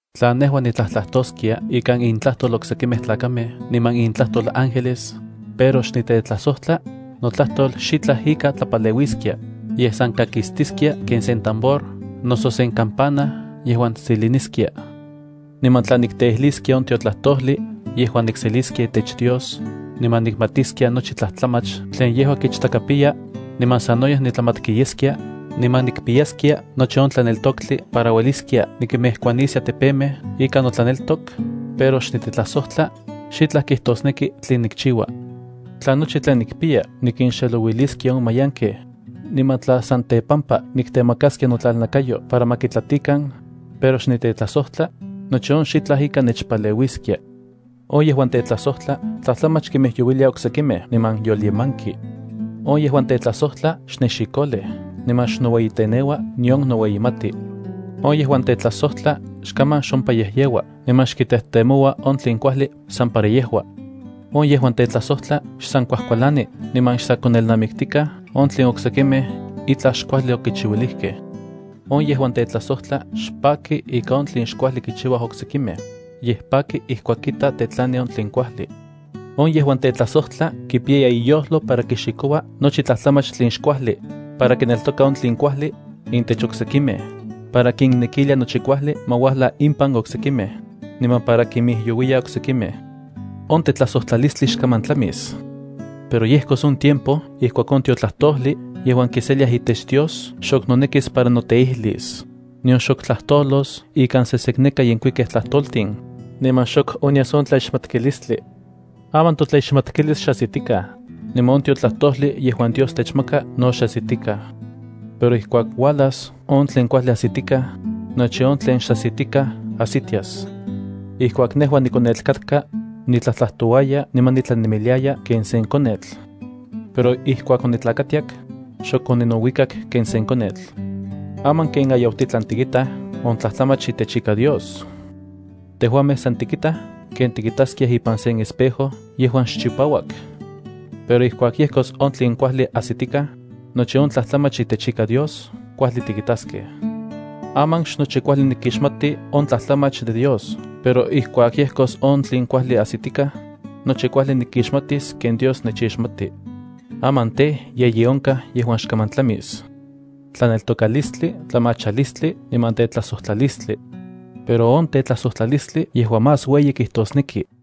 Tla nejua nitlajtlajtoskia ikan intlajtol oksekimej tlakamej niman intlajtol ángeles, pero xnitetlajsojtla, notlajtol xitlaj ika tlapaleuiskia, yej san kakistiskia ken sen tambor noso sen kampana yejuan tsiliniskia. Niman tla nikteijliskia on tiotlajtojli yejuan nikseliskia itech Dios, niman nikmatiskia nochi tlajtlamach tlen yejua kichtakapiya, niman sanoyej nitlajmatki yeskia, niman nikpiyaskia nochi on tlaneltoktli para ueliskia nikimejkuaniskia tepemej ika notlaneltok, pero xnitetlajsojtla, xitlaj kijtosneki tlen nikchiua. Tla nochi tlen nikpiya nikinxelouiliskia on mayankej, niman tla san tepampa niktemakaskia notlalnakayo para ma kitlatikan, pero xnitetlajsojtla, nochi on xitlaj ika nechpaleuiskia. On yejuan tetlajsojtla tlajtlamach kimijyouilia oksekimej niman yolyemanki. On yejuan tetlajsojtla xnexikolej, niman xnoueyiteneua nion noueyimati. On yejuan tetlajsojtla xkaman xompayejyeua niman xkitejtemoua on tlen kuajli san para yejua. On yejuan tetlajsojtla xsan kuajkualani, niman xsa konelnamiktikaj on tlen oksekimej itlaj xkuajli okichiuilijkej. On yejuan tetlajsojtla xpaki ika on tlen xkuajli kichiuaj oksekimej, yej paki ijkuak kita tetlani on tlen kuajli. On yejuan tetlajsojtla kipiya iyojlo para kixikoua nochi tlajtlamach tlen xkuajli, para kineltoka on tlen kuajli intech oksekimej, para kinnekilia nochi kuajli ma uajla impan oksekimej, niman para kimijyouiya oksekimej. On yejuan tetlajsojtla xkaman tlami itetlajsojtlalis. Pero yejkos on tiempo ijkuak on tiotlajtojli yejuan kiseliaj itech Dios xok nonekis para noteijlis, nion xok tlajtolos ikan sesekneka yenkuikej tlajtoltin, niman xok onyas on tlaixmatkilistli. Aman totlaixmatkilis xajsitikaj, niman on tiotlajtojli yejuan Dios techmaka no xajsitikaj. Pero ijkuak uajlas on tlen kuajli ajsitikaj, nochi on tlen xajsitikaj ajsitias. Ijkuak nejua nikonetl katka, nitlajtlajtouaya niman nitlanemiliaya ken sen konetl. Pero ijkuak onitlakatiak, xok oninouikak ken sen konetl. Aman ken ayautitlan tikitaj on tlajtlamach itech ika Dios. Tejuamej san tikitaj ken tikitaskiaj ipan sen espejo yejuan xchipauak. Pero ijkuak yejkos on tlen kuajli ajsitikaj, nochi on tlajtlamach itech ika Dios kuajli tikitaskej. Aman xnochi kuajli nikixmati on tlajtlamach de Dios. Pero ijkuak yejkos on tlen kuajli ajsitikaj, nochi kuajli nikixmatis ken Dios nechixmati. Aman tej, yeyi onkaj yejuan xkaman tlamis: tlaneltokalistli, tlamachalistli niman tetlajsojtlalistli. Pero on tetlajsojtlalistli yejua más ueyi kijtosneki.